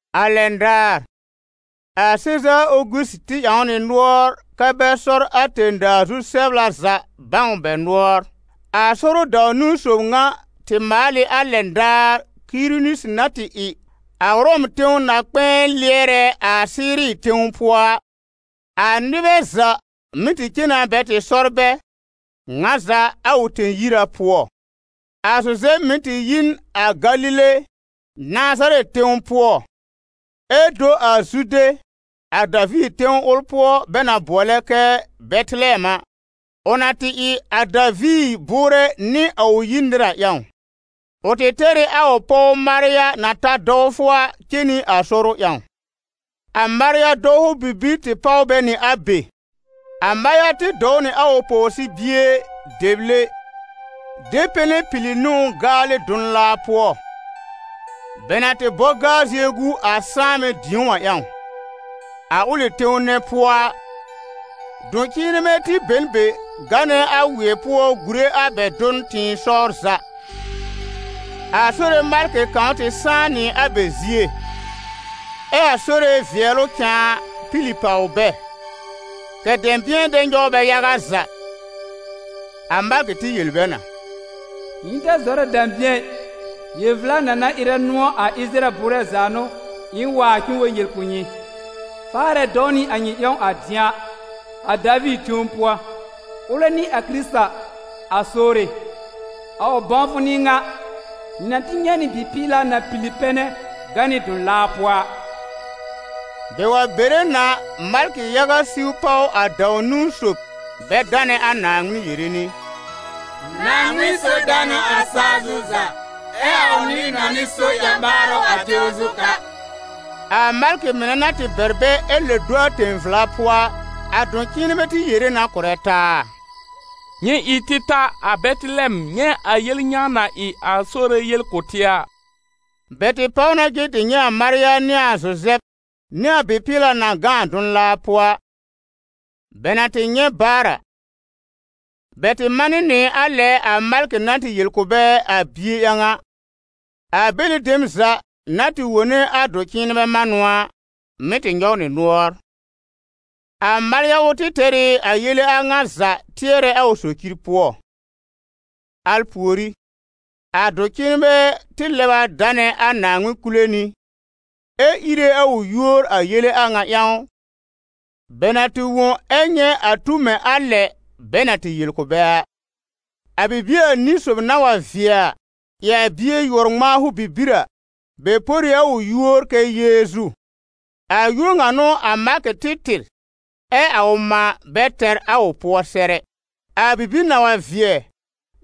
A lɛn daar, a Sezaar Ogusi tɩ ƴãw nɩ nʋɔr kɛ́ bɛ sɔr a tẽ-daa zu-sɛbla za bãw bɛ nʋɔr. A sɔrʋ dãw-niwn sob ŋa tɩ maal ɩ a lɛn daar Kirinisi na tɩ ɩ a Ʋrɔm tẽw na-kpɛ̃ɛ lɩɛrɛ a Siiri tẽw pʋɔ a. A nɩbɛ za mɩ́ tɩ cen na bɛ tɩ sɔr bɛ, ŋa za a ʋ tẽ-yira pʋɔ. A Zuzɛb mɩ̀ tɩ yi n a Galile, Nazarɛtɩ tẽw pʋɔ, ɛ do a Zude, a Daviir tẽw ʋl pʋɔ bɛ na bʋɔlɛ kɛ Bɛtɩlɛm a, ʋ na tɩ ɩ a Daviir bʋʋrɛ nɩ a ʋ yir nɩr a ƴãw. Ʋ tɩ tɛr ɩ a ʋ pɔw Marya na ta dɔwfʋ a cen nɩ a sɔrʋ ƴãw. A Marya dɔwfʋ bibir tɩ páw bɛ nɩ a be. A Marya tɩ dɔw nɩ a ʋ pɔwsɩ-bie, dɛble, de pɛnɛ pili nɩ ʋ gaalɩ dʋn-laa pʋɔ, bɛ na tɩ bɔ gaa-zie gu a sãanbɛ-dĩ̀ó a ƴãw. A ʋlɩ tẽw nɛ pʋɔ a, dʋ̃-cɩ̃ɩnbɛ tɩ be n be, gánɛ a wɩɛ pʋɔ gùre a bɛ dʋn tɩ̃ɩsɔwr za. A Sore malkɩ kãw tɩ sãá nɩ a bɛ zie, ɛ a Sore vɩɛlʋ cãa pili pàw bɛ, kɛ̀ dɛ̃bɩ̃ɛ dɛ nyɔw bɛ yaga za. A malkɩ tɩ yel bɛ na: «Nyɩ ta zɔrɛ dɛ̃bɩ̃ɛ ɩ, yel-vla na na ɩrɛ nʋ̃ɔ̀ a Ɩsɩrayɛl bʋʋrɛ za a n'ʋ, ɩ̃ waar k'ɩ̃ɩ wa yel kʋ̀ nyɩ. Faarɛ dɔw nɩ a nyɩ ƴãw a dɩ̃a, a Daviir tẽw pʋɔ, ʋlɛ n'ɩ a Kɩrɩta, a Sore. A ʋ bãwfʋ n'ɩ ŋa: nyɩ na tɩ nyɛ̃ nɩ bɩ-pɩɩla na pili pɛnɛ gã nɩ dʋn-laa pʋɔ a. Bɛ wa bere na, malkɩ-yaga siw páw a dãw-niwn sob bɛ danɛ a Naaŋmɩn yere nɩ: ‹Naaŋmɩn so danʋ a sa-zu za, ɛ a ʋ nɩ-nɔnɩ so ƴã-ɓaarʋ a tẽw zu ka›.» A malkɩ mɩnɛ na tɩ bɛr bɛ ɛ lɛb do a tẽ-vla pʋɔ a, a dʋ-cɩ̃ɩnbɛ tɩ yere na kʋ̀rɛ taa: «Nyɩ ɩ tɩ ta a Bɛtɩlɛm nyɛ̃ a yel ŋa na ɩ a Sore yel kʋ̀ tɩ a.» Bɛ tɩ páw na cen tɩ nyɛ̃ a Marya nɩ a Zuzɛb nɩ a bɩ-pɩɩla na gã a dʋn-laa pʋɔ a. Bɛ na tɩ nyɛ̃ baar a, bɛ tɩ manɩ nɩ a lɛ a malkɩ na yel kʋ̀ bɛ a bie ƴãw a. A bɛlɩ dem za na tɩ wone a dʋ̃-cɩ̃ɩnbɛ manʋ a, mɩ́ tɩ nyɔw nɩ nʋɔr. A Marya ʋl tɩ tɛr ɩ a yele a ŋa za tɩɛrɛ a ʋ socir pʋɔ. Al pùorí, a dʋ̃-cɩ̃ɩnbɛ tɩ lɛb a danɛ a Naaŋmɩn kule nɩ, ɛ íre a ʋ yúor a yele a ŋa ƴãw, bɛ na tɩ wõ ɛ nyɛ̃ a tu mɛ̃ a lɛ bɛ na tɩ yel kʋ̀ bɛ a. A bibie anĩ sob na wa vɩɛ a, ɩ a bie yʋɔr-ŋmãafʋ bibir a, bɛ por ɩ a ʋ yúor kɛ Yeezu. A yúor ŋa n'ʋ a malkɩ tɩ tɩr, ɛ a mã bɛ tɛr a ʋ pʋɔ sɛr ɛ. A bibir na wa vɩɛ,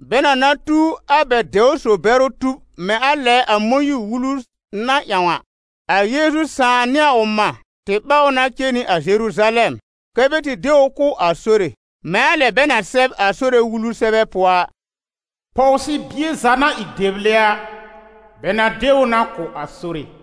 bɛ na na tu a bɛ dɛwr-so-bɛrʋ tub mɛ̃ a lɛ a Mõyiir-Wulu na ƴãw a, a Yeezu sãà nɩ a ʋ mã tɩ ɓáw ʋ na cen nɩ a Zeruzalɛm, kɛ́ bɛ tɩ de ʋ kʋ̀ a Sore, mɛ̃ a lɛ bɛ na sɛb a Sore Wulu sɛbɛ pʋɔ a: «Pɔwsɩ-bie za na ɩ dɛble a, bɛ na de ʋ na kʋ̀ a Sore.»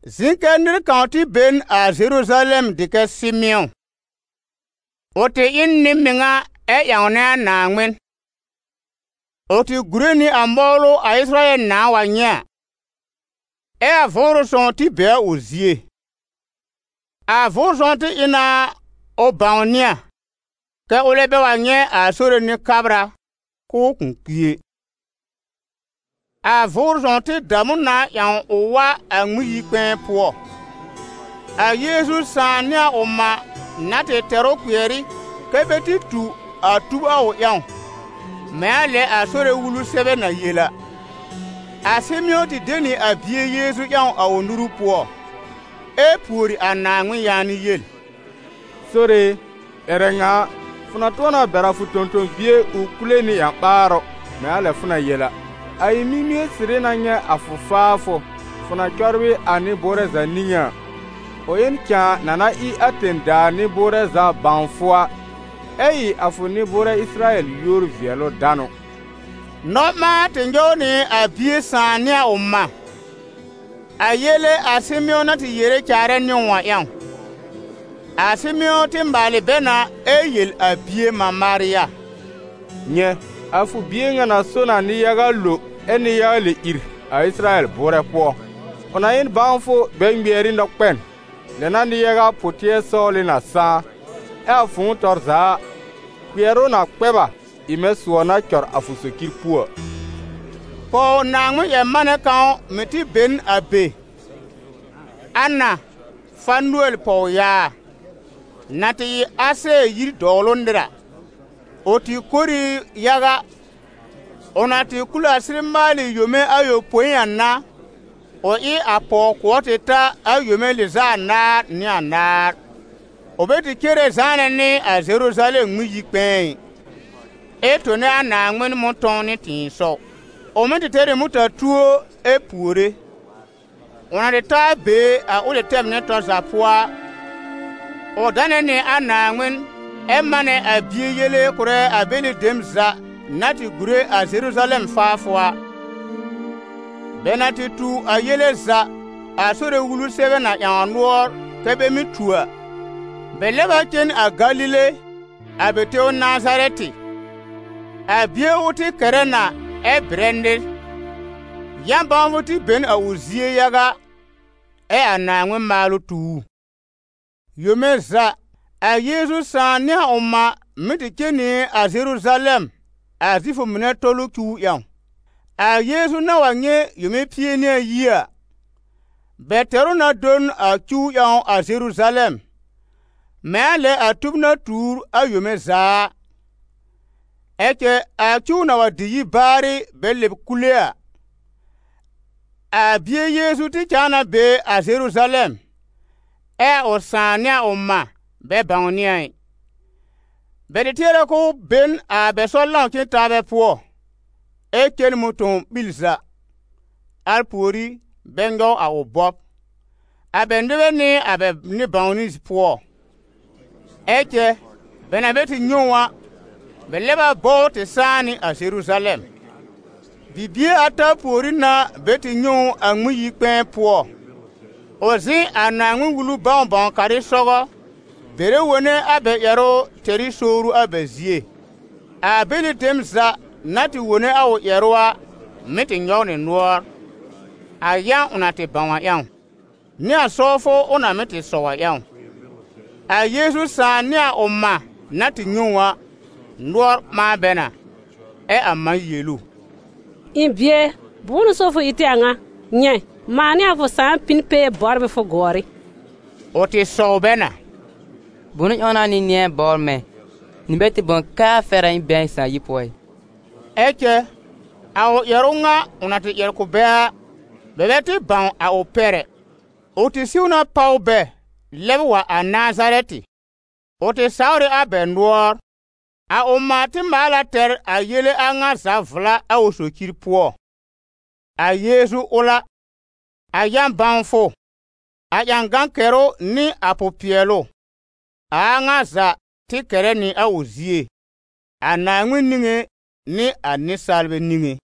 Zɩ̃ kɛ nɩr kãw tɩ be n a Zeruzalɛm dɩ kɛ Sɩmɩ̃ɔ. Ʋ tɩ ɩ n nɩ-mɩŋa ɛ ƴãwnɛ a Naaŋmɩn. Ʋ tɩ gùre nɩ a mɔwlʋ a Ɩsɩrayɛl nãá wa nyɛ̃ a, ɛ a Vʋʋrʋ sõw tɩ be a ʋ zie. A Vʋʋrʋ Sõw tɩ ɩ na ʋ bãwnɩ a, kɛ ʋlɛ bɛ wa nyɛ̃ a Sore Nɩ-kabra, k'ʋʋ kʋ̃ kpi ɛ. A Vʋʋrʋ Sõw tɩ dam ʋ na ƴãw ʋ wa a Ŋmɩn-yi-kpɛ̃ɛ pʋɔ. A Yeezu sãà nɩ a ʋ mã na tɩ tɛr ʋ kpɩɛr ɩ kɛ bɛ tɩ tu a tub a ʋ ƴãw, mɛ̃ a lɛ a Sore Wulu sɛbɛ na yel a, a Sɩmɩ̃ɔ tɩ de nɩ a bie Yeezu ƴãw a ʋ nuru pʋɔ, ɛ pùori a Naaŋmɩn yaanɩ yel: «Sore e, ƴɛrɛ ŋa a, fʋ na tʋ̃ɔ na bɛr a fʋ tõ-tõ-bie ʋ kule nɩ ƴã-ɓaarʋ mɛ̃ a lɛ fʋ na yel a. A ɩ̃ mimie sɩrɩ na nyɛ̃ a fʋ faafʋ, fʋ na cɔbrɩ a nɩ-bʋʋrɛ za niŋé a: ʋ ɩ n cãa na na ɩ a tẽ-daa nɩ-bʋʋrɛ za bãw fʋ a, ɛ ɩ a fʋ nɩ-bʋʋrɛ Ɩsɩrayɛl yúor-vɩɛlʋ-danʋ.» Nɔ-ɓãan tɩ nyɔw nɩ a bie sãà nɩ a ʋ mã, a yele a Sɩmɩ̃ɔ na tɩ yere caarɛ nɩ ʋ a ƴãw. A Sɩmɩ̃ɔ tɩ maalɩ bɛ na ɛ yel a bie mã Marya: «Nyɛ̃, a fʋ bie ŋa na so na nɩ-yaga lo ɛ nɩ-yaga lɛb ìr a Ɩsɩrayɛl bʋʋrɛ pʋɔ, ʋ na ɩ n bãwfʋ bɛ ŋmɩɛr ɩ nɔ-kpɛn. Lɛ n'a nɩ-yaga pʋ-tɩɛr-sɔwlɩ na sãá. Ɛ a fʋ̃ʋ tɔr za a, kpɩɛrʋ na kpɛ b a, ɩ mɛ̃ sʋɔ na cɔr a fʋ socir puo a.» Pɔw- Naaŋmɩn-ƴɛr-manɛ kãw mɩ̀ tɩ be n a be, Ana, Fanɩɛl pɔwyaa, na tɩ ɩ a Asɛɛr yir dɔwlʋ nɩr a. Ʋ tɩ kor ɩ yaga. Ʋ na tɩ kul a sɩr maalɩ yome ayopõi a n'a, ʋ ɩ a pɔw-kʋɔr tɩ ta a yome lɩz'a anaar nɩ anaar. Ʋ bɛ tɩ cere zãanɛ nɩ a Zeruzalɛm Ŋmɩn-yi-kpɛ̃ɛ ɩ, ɛ tone a Naaŋmɩn mʋ̃tɔ̃w nɩ tɩ̃ɩsɔw. Ʋ mɩ́ tɩ tɛr ɩ mʋta-tuo ɛ puore. Ʋ na tɩ ta a be a ʋlɩ tɛm nɛ tɔr za pʋɔ a, ʋ danɛ nɩ a Naaŋmɩn ɛ manɛ a bie yele kʋ̀rɛ a bɛlɩ dem za na tɩ gùre a Zeruzalɛm faafʋ a. Bɛ na tɩ tu a yele za, a Sore Wulu sɛbɛ na ƴãw nʋɔr kɛ bɛ mɩ́ tu a, bɛ lɛb a cen a Galile, a bɛ tẽw Nazarɛtɩ. A bie ʋl tɩ kɛrɛ na ɛ bɩrɛ nɩr, yã-bãwfʋ tɩ be n a ʋ zie yaga, ɛ a Naaŋmɩn maalʋ tu ʋ. Yome za, a Yeezu sãà nɩ a ʋ mã mɩ́ tɩ cen nɩ a Zeruzalɛm a Zifʋ mɩnɛ Tɔlʋ cuw ƴãw. A Yeezu na wa nyɛ̃ yome pie nɩ ayi a, bɛ tɛr ʋ na do n a cuw ƴãw a Zeruzalɛm, mɛ̃ a lɛ a tub na tuur a yome za a. Ɛ cɛ a cuw na wa dɩ yi baarɩ bɛ lɛb kule a, a bie Yeezu tɩ cãa na be a Zeruzalɛm, ɛ a ʋ sãà nɩ a ʋ mã bɛ bãwnɩ a ɩ. Bɛ tɩ tɩɛr k'ʋʋ be n a bɛ sɔr-lãw-cen-taabɛ pʋɔ, ɛ cen mʋ̃tɔ̃w ɓil za, al pùorí bɛ nyɔw a ʋ bɔb, a bɛ nɩbɛ nɩ a bɛ nɩ-bãwnɩ pʋɔ. Ɛ cɛ bɛ na bɛ tɩ nyɛ̃ ʋ a, bɛ lɛb a bɔ ʋ tɩ sãá nɩ a Zeruzalɛm. Bibie ata pùorí n'a bɛ tɩ nyɛ̃ ʋ a Ŋmɩn-yi-kpɛ̃ɛ pʋɔ, ʋ zɩ̃ a Naaŋmɩn-Wulu bãw-bãw-karɩ sɔgɔ, bɛrɛ wone a bɛ ƴɛrʋ tɛr ɩ sowru a bɛ zie. A bɛlɩ dem za na tɩ wone a ʋ ƴɛrʋ a, mɩ́ tɩ nyɔw nɩ nʋɔr, a yã ʋ na tɩ bãw a ƴãw, nɩ a sɔwfʋ ʋ na mɩ́ tɩ sɔw a ƴãw. A Yeezu sãà nɩ a ʋ mã na tɩ nyɛ̃ ʋ a, nʋɔr ɓãa bɛ na, ɛ a mã yel ʋ: «Ɩ̃ bie e, bʋ̃ʋ n'ʋ so fʋ ɩ tɩ a ŋa? Nyɛ̃, mãa nɩ a fʋ sãà pĩ n pee bɔbr ɩ fʋ gʋɔrɩ.» Ʋ tɩ sɔw bɛ na: «Bʋnʋ ƴãw n'a nyɩ nɩ̃ɛ bɔbr mɛ̃? Nyɩ bɛ tɩ bãw kɛ a fɛr a k'ɩ̃ɩ be a ɩ̃ sãà yir pʋɔ ɩ?» Ɛ cɛ a ʋ ƴɛrʋ ŋa ʋ na tɩ ƴɛr kʋ̀ bɛ a, bɛ bɛ tɩ bãw a ʋ pɛr ɛ. Ʋ tɩ siw na páw bɛ, lɛb wa a Nazarɛtɩ; ʋ tɩ sawr ɩ a bɛ nʋɔr. A ʋ mã tɩ maal a tɛr a yele a ŋa za vla a ʋ socir pʋɔ. A Yeezu ʋl a, a yã-bãwfʋ, a ƴãgan kɛrʋ nɩ a pʋ-pɩɛlʋ, a a ŋa za tɩ kɛrɛ nɩ a ʋ zie, a Naaŋmɩn niŋé nɩ a nɩsaalbɛ niŋé.